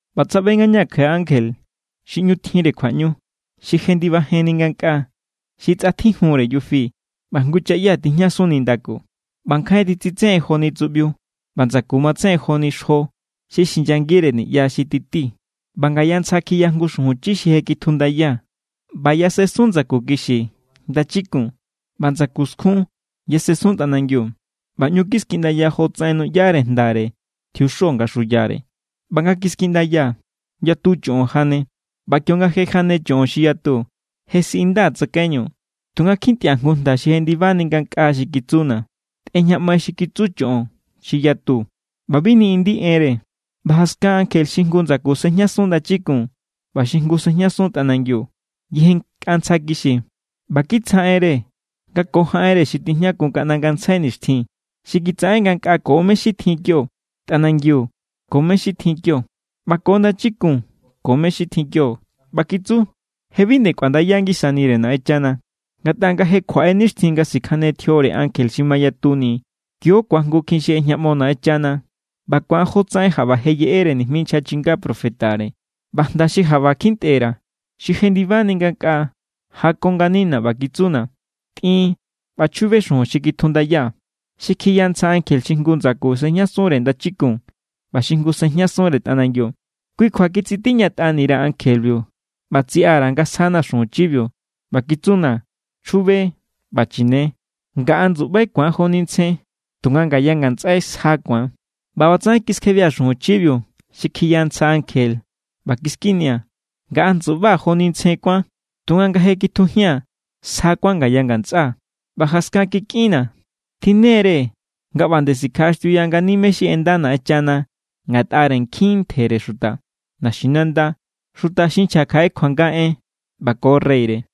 ꞌBa tsaꞌbe ngañaa̱ kjaꞌe ankje xi ꞌñu tjinre kjuaꞌñu, xi jendibajenni ngankꞌaa. Xi tsꞌatjijunre yufi ꞌba jngu chaꞌya tijñasun nindaku. ꞌBa nkjain titsitsejen joni tsuꞌbiu, ꞌba ndsaku matsejen joni xjo xi xinyangire niꞌya xi tití. ꞌBa ngaya ntsja kjiya jngu xuju chi xi je kjitjundaya. ꞌBa yasensun ndsaku kixi ndachikun ꞌba ndsaku skjun yasensun tꞌanangiu. ꞌBa ꞌñu kiskiꞌndaya jotsaꞌen nuꞌyare jndare tjiuxo nga xuyare. ꞌBa nga kiskiꞌndaya, yatu choꞌon jane. ꞌBa kionga je jane choꞌon xi yatu, je siꞌindaa̱ tsakaiñu, tunga kjintꞌia̱ jngu jnda xi jendibani ngankꞌaa xi kitsuna̱: “Tꞌejñaꞌmai xi kitsu choꞌon xi yatu ꞌba bi niꞌindi enre.” ꞌBa jaskan ankje xi jngu ndsaku sejñasun ndachikun ꞌba xi jngu sejñasun tꞌanangiu yejennkꞌa ntsja kixi. ꞌBa kitsjaꞌenre nga ko jaꞌenre xi tijñakun kaꞌnda ngantsjai nixtjin, xi kitsaꞌen ngankꞌaa ko mé= xi tjin kio, tꞌanangiu ko mé= xi tjin kio, ꞌba ko ndachikun ko mé= xi tjin kio. ꞌBa kitsu: “Je bi nde kꞌuandaya ngisanire Naꞌenchana. Ngatꞌa nga je kjuaꞌe nixtjin nga sikjane tjiore ankje xi mayatuni, kio= ku̱ajngukjin xi ꞌejñaꞌmo Naꞌenchana. ꞌBa ku̱an jotsaꞌen jaꞌba je yeꞌere nijmi nchja chinga profetare.” ꞌBa jnda xi jaꞌba kjintꞌe_ra̱, xi jendibani ngankꞌaa, jako nganina̱ ꞌba kitsuna̱: “Tꞌin ꞌba chjube xujun xi kjitjundaya, xi kjiya ntsja ankje xi jngu ndsaku sejñasunre ndachikun ꞌba xi jngu sejñasunre tꞌanangiu.” Kui kjua kitsitiñatꞌani_ra̱ ankjebiu ꞌba tsiꞌa_ra̱ nga sjana̱ xujun chibiu. ꞌBa kitsuna̱: “Chjube ꞌba chine. Ngaꞌa ndsuꞌbai ku̱an joni ntsjen, tunga ngaya ngatsꞌai sja ku̱an.” ꞌBa ꞌbatsaꞌen kiskjebia̱ xujun chibiu xi kjiya ntsja ankje ꞌba kiskinia̱. Ngaꞌa ndsuꞌbaa̱ joni ntsjen kuán, tunga nga je kitjujia̱n, sja kuán ngaya ngandsꞌaa̱. ꞌBa jaskan kikꞌinnaa̱: “Tjinne=re nga ꞌba nde sikjaꞌaxtiuya ngani mé= xi ꞌenda Naꞌenchana ngatꞌare nkjin ntjere xuta, naxinanda, xuta xi nchja kjaꞌe kjuanga en ꞌba ko reyre.”